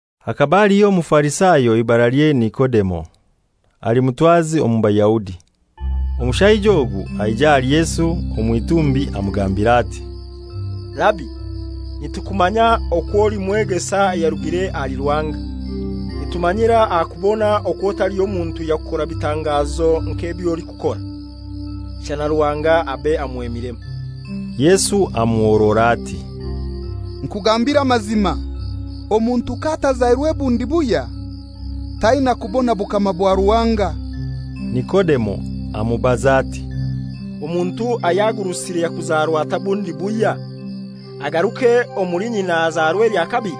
Hakaba haliho Omufarisayo eibaralye Nikodemo, ali mutwazi omu Bayahudi. Omushaija ogu aija ahali Yesu omw'itumbi amugambira ati, «Rabi, nitukumanya okwo oli mwegesa ayarugire ahali Ruhanga. Nitumanyira aha kubona okwo taliho muntu yakukora bitangazoki nk'ebyolikukora, shana Ruhanga abe amwemiremu.» Yesu amuhorora ati, «Nkugambire amazima, omuntu k'atazairwe bundi buhya taina kubona bukama bwa Ruhanga.» Nikodemo amubaza ati, «Omuntu ayagurusire yakuzarwa atai bundi buhya? Agaruke omuli nyina azarwe elya kabili?»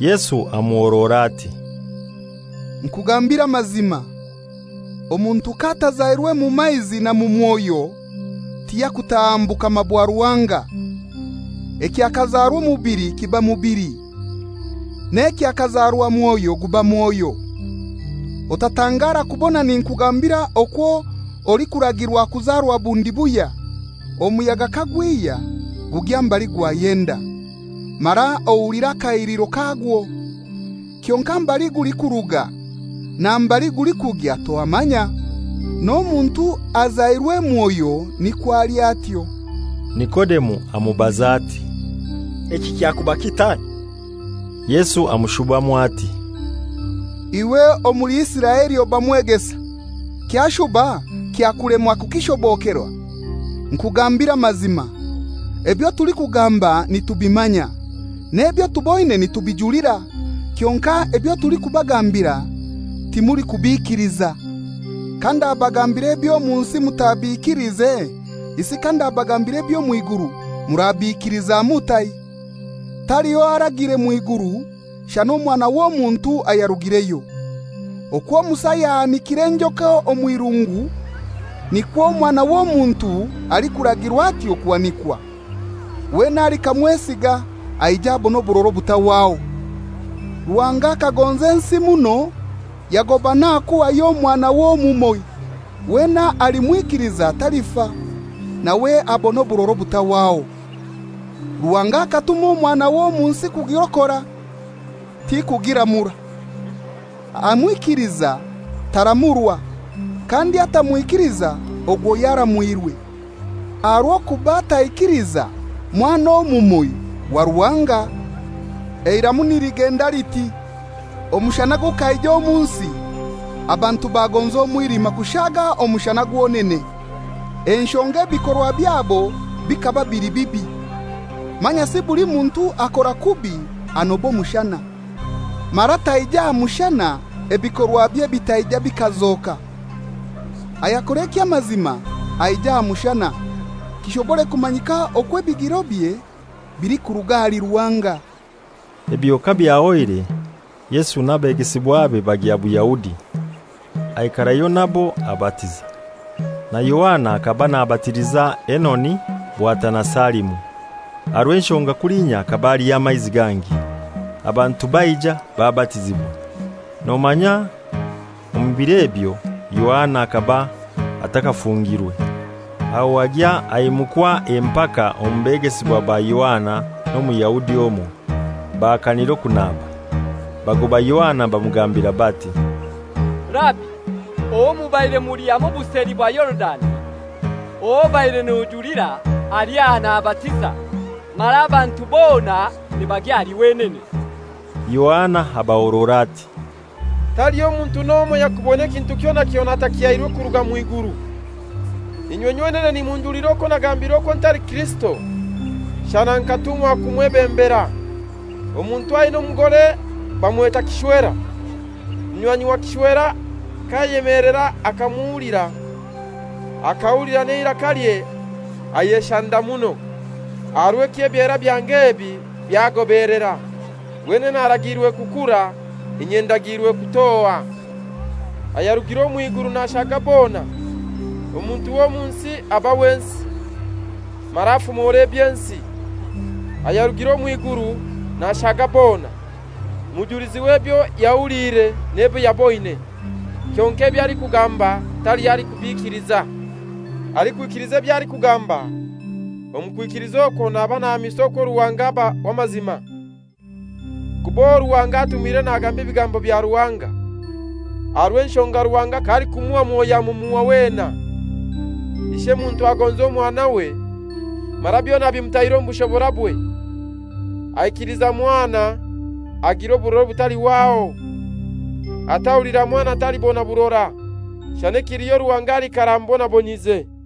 Yesu amuhorora ati, «Nkugambire amazima, omuntu k'atazairwe mu maizi na mu Mwoyo tiyakutaha mu bukama bwa Ruhanga. Ekyakazarwa omubili kiba mubili, n'ekyakazarwa Mwoyo guba Mwoyo. Otatangara kubona ninkugambira okwo olikuragirwa kuzarwa bundi buhya. Omuyaga kagwihya gugya mbali gwayenda, mara ohulira akahiliro kagwo. Kyonkai mbali gulikuruga na mbali gulikugya tohamanya. N'omuntu azairwe Mwoyo nikwo ali atyo.» Nikodemo amubaza ati, «Eki kyakuba kitai?» Yesu amushubamu ati, «Iwe omuli Isiraeli oba mwegesa, kyashuba kyakulema kukishobokerwa? Nkugambire amazima, ebyo tulikugamba nitubimanya, n'ebyo tuboine nitubijulira; kyonkai ebyo tulikubagambira timulikubikiliza. Kandabagambira eby'omu nsi mutabikiliize isi kandabagambira eby'omw'iguru murabiikiliza mutai? Taliho aragiire mw'iguru, shana Omwana w'Omuntu ayarugireyo. Okwo Musa yahanikire enjoka omw'irungu nikwo Omwana w'Omuntu alikuragirwa atyo kuhanikwa, wena alikamwesiga aije abone oburora obutahwaho. «Ruhanga akagonza ensi muno yagoba n'aha kuhayo Omwanawe omumoi, wena alimwikiliza talifa, nawe abone oburora obutahwaho. Ruhanga akatuma Omwanawe omu nsi kugirokora, tikugiramura. Amwikiliza taramurwa, kandi atamwikiliza ogwo yaramwirwe, aha rw'okuba taikiliza Mwana omumoi wa Ruhanga. Eiramu niligenda liti: Omushana gukaija omu nsi, abantu bagonza omwilima kushaaga omushana gwonene, enshonga ebikorwa byabo bikaba bili bibi. Manyasi buli muntu akora kubi anoba omushana, mara taija aha mushana ebikorwabye bitaija bikazoka. Ayakora eky'amazima aija aha mushana, kishobore kumanyika okwo ebigirobye bilikuruga ahali Ruhanga.» Ebyo kabyahoire, Yesu n'abegesibwabe bagya Buyahudi; aikarayo nabo abatiza. Na Yohana hakaba nabatiliza Enoni bwatana Salimu, aha rw'enshonga kulinya bhakaba haliyo amaizi gangi. Abantu baija babatizibwa. Nomanya omu bir'ebyo Yohana hakaba atakafungirwe. Aho agya aimukwa empaka omu begesibwa ba Yohana n'Omuyahudi omoi, bahakanira okunaba. Bagoba Yohana bamugambira bati, «Rabi, owo mubaire muli hamoi buseli bwa Yorudani, ow'obare nojulira ali aha nabatiza, mara abantu bona nibagya ahali wenene.» Yohana abahorora ati, «Taliho muntu n'omoi ayakubona kintu kyona kyona atakihairwe kuruga mw'iguru. Inywe nywenene nimunjulira okwo nagambire okwo ntali Kirisito, shana nkatumwa kumwebembera. Omuntu aina omugore bamweta kishwera. Munywanyi wa kishwera k'ayemelera akamuhulira, ak'ahulira n'eirakalye ayeshanda muno. Aha rw'ekyo ebyera byange ebi byagobelera. Wenene aragiirwe kukura, inye ndagiirwe kutoha.» Ayarugire omw'iguru nashaga bona. Omuntu ow'omu nsi aba w'ensi, mara afumora eby'ensi; ayarugire omw'iguru nashaga bona. Mujulizi w'ebyo yahuliire n'ebyo yaboine, kyonkai eby'alikugamba taliho alikubikiliza. Alikwikiliza eby'alikugamba, omu kwikiliza okwo naba nahamisa okwo Ruhanga aba w'amazima. Kuba owo Ruhanga atumire nagamba ebigambo bya Ruhanga, aha rw'enshonga Ruhanga k'alikumuha Mwoyo amumuha wena. Ish'emuntu agonza Omwanawe, mara byona abimutaire omu bushoborabwe. Aikiliza Mwana agira oburora obutalihwaho. Atahulira Mwana talibona burora, shana ekiliho Ruhanga aliikara amubonabonyize.